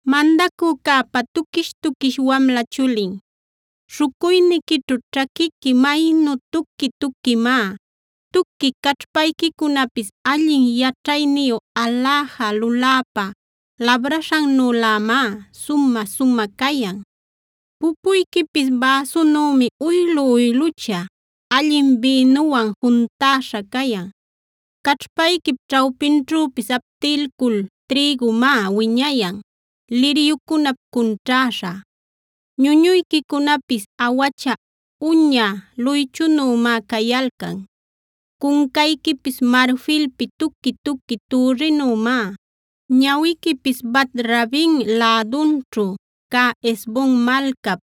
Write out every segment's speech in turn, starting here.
Mandacücäpa tuquish-tuquish wamla chulin, śhucuyniquićhu ćhaquiqui maynu tuqui-tuquimá. Tuqui caćhpayquicunapis allin yaćhayniyu aläja luläpa labraśhannülämá sumä-sumä cayan. Pupuyquipis bäsunümi uylu-uylucha, allin bïnuwan juntäśha cayan. Caćhpayquip ćhawpinćhüpis aptilcuy trïgumá wiñayan, liryucunap cunćhäśha. Ñuñuyquicunapis awacha uña luychunümá cayalcan.a Cuncayquipis marfilpi tuqui-tuqui türrinümá; ñawiquipis Bat-rabim lädunćhu cä Hesbon malcap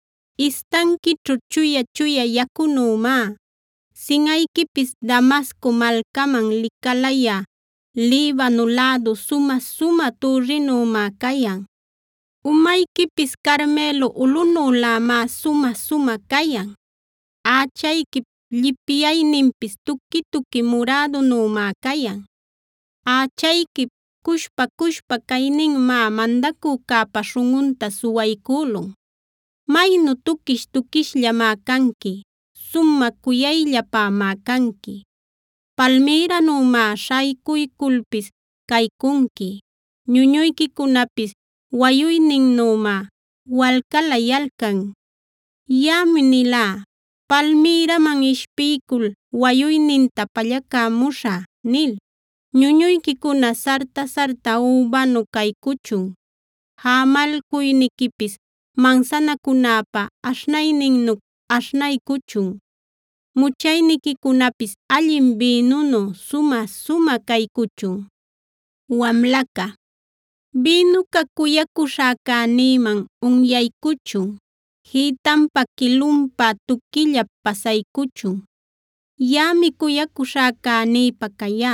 istanquićhu chuya-chuya yacunümá; sinꞌayquipis Damasco malcaman licalayä Libano lädu sumä-sumä türrinümá cayan. Umayquipis Carmelo ulꞌunülämá sumä-sumä cayan; ächayquip llipyayninpis tuqui-tuqui murädunümá cayan; ächayquip cushpa-cushpa cayninmá mandacücäpa śhunꞌunta suwaycülun. Maynu tuquish-tuquishllamá canqui; sumä cuyayllapämá canqui. Palmïranümá śhaycuyculpis caycunqui; ñuñuyquicunapis wayuyninnümá walcalayalcan. Yaꞌami nilá “Palmïraman ishpiycul wayuyninta pallacämuśhä” nil. Ñuñuyquicuna sarta-sarta übanu caycuchun; jämalcuyniquipis mansanacunäpa aśhnayninnu aśhnaycuchun. Muchayniquicunapis allin bïnunu sumä-sumä caycuchun. Wamlaca Bïnuca cuyacuśhäcänïman unyaycuchun; jïtanpa quilunpa tuquillap pasaycuchun. Yaꞌami cuyacuśhäcänïpä cayá;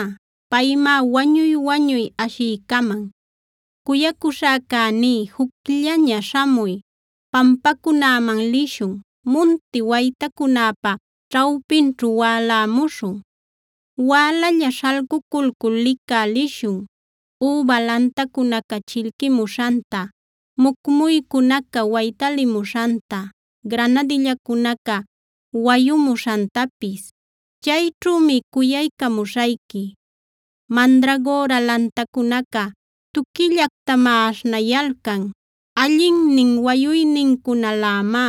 paymá wañuy-wañuy ashiycaman. Cuyacuśhäcäní, jucllaña śhamuy; pampacunäman lishun, munti waytacunäpa ćhawpinćhu wälämuśhun. Wälalla śhalcuculcul licä lishun, üba lantacunaca chillquimuśhanta, mucmuycunaca waytalimuśhanta, granadillacunaca wayumuśhantapis. Chayćhümi cuyaycamuśhayqui. Mandragora lantacunaca tuquillactamá aśhnayalcan. Allinnin wayuynincunalämá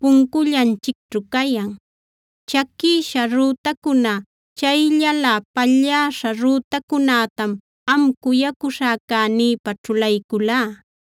puncullanchicćhu cayan; chaquïsha rütacuna, chayllalä palläśha rütacunätam am cuyacuśhäcänïpä ćhulayculá.